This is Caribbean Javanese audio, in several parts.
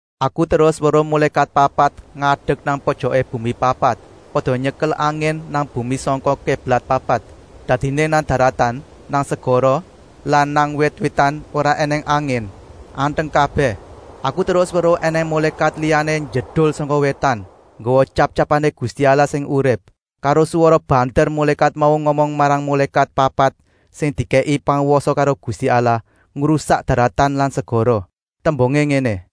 Aku terus weruh mulékat papat ngadek nang pojoké bumi papat, pada nyekel angin nang bumi sangka kéblat papat. Dadiné nang daratan, nang segara lan nang wit-witan ora ènèng angin, anteng kabèh. Aku terus weruh ènèng mulékat liyané njedul sangka wétan, nggawa tyap-tyapané Gusti Allah sing urip. Karo swara banter mulékat mau ngomong marang mulékat papat sing dikèki pangwasa karo Gusti Allah ngrusak daratan lan segara. Tembungé ngéné: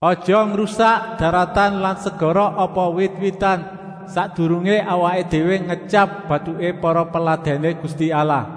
“Aja ngrusak daratan lan segara apa wit-witan, sakdurungé awaké déwé ngetyap batuké para peladèné Gusti Allah.”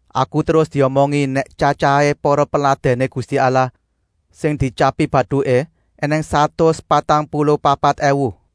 Aku terus diomongi nèk tyatyahé para peladèné Gusti Allah sing dietyapi batuké ènèng satus patang puluh papat èwu.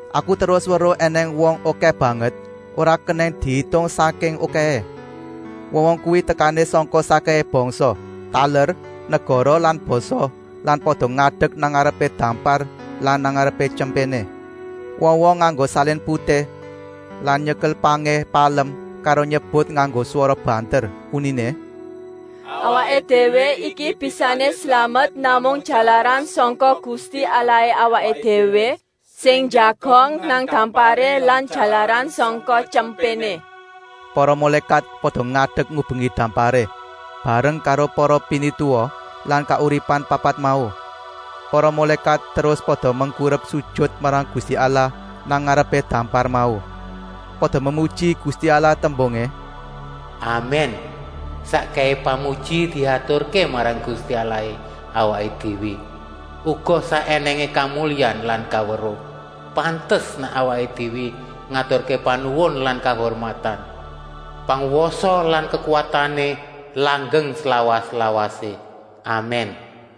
Aku terus weruh ènèng wong okèh banget, ora kenèng diitung sangking okèhé. Wong-wong kuwi tekané sangka sakkèhé bangsa, taler, negara lan basa lan pada ngadek nang ngarepé dampar lan nang ngarepé Tyempéné. Wong-wong nganggo salin putih lan nyekel pangé palem karo nyebut nganggo swara banter, uniné: “Awaké déwé iki bisané slamet namung jalaran sangka Gusti Allahé awaké déwé sing njagong nang damparé lan jalaran sangka Tyempéné.” Para mulékat pada ngadek ngubengi damparé, bareng karo para pinituwa lan kauripan papat mau. Para mulékat terus pada mengkurep sujut marang Gusti Allah nang ngarepé dampar mau. Pada memuji Gusti Allah tembungé: “Amèn! Sakkèhé pamuji diaturké marang Gusti Allahé awaké déwé, uga sak ènèngé kamulyan lan kaweruh. Pantes nèk awaké déwé ngaturké panuwun lan kahurmatan. Pangwasa lan kekuwatané langgeng slawas-lawasé. Amèn!”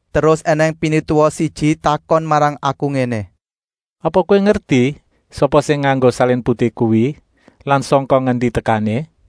Terus ènèng pinituwa siji takon marang aku ngéné: “Apa kowé ngerti sapa sing nganggo salin putih kuwi lan sangka ngendi tekané?”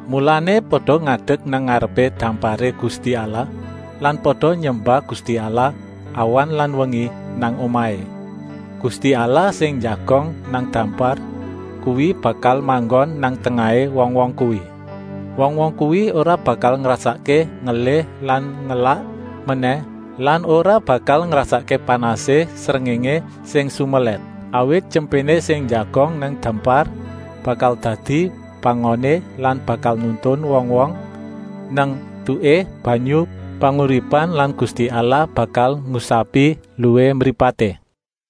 Mulané pada ngadek nang ngarepé damparé Gusti Allah lan pada nyembah Gusti Allah awan lan wengi nang omahé. Gusti Allah sing njagong nang dampar kuwi bakal manggon nang tengahé wong-wong kuwi. Wong-wong kuwi ora bakal ngrasakké ngelih lan ngelak menèh lan ora bakal ngrasakké panasé srengéngé sing sumelèt. Awit Tyempéné sing njagong nang dampar bakal dadi pangoné lan bakal nuntun wong-wong nang etuké banyu panguripan lan Gusti Allah bakal ngusapi eluhé mripaté.”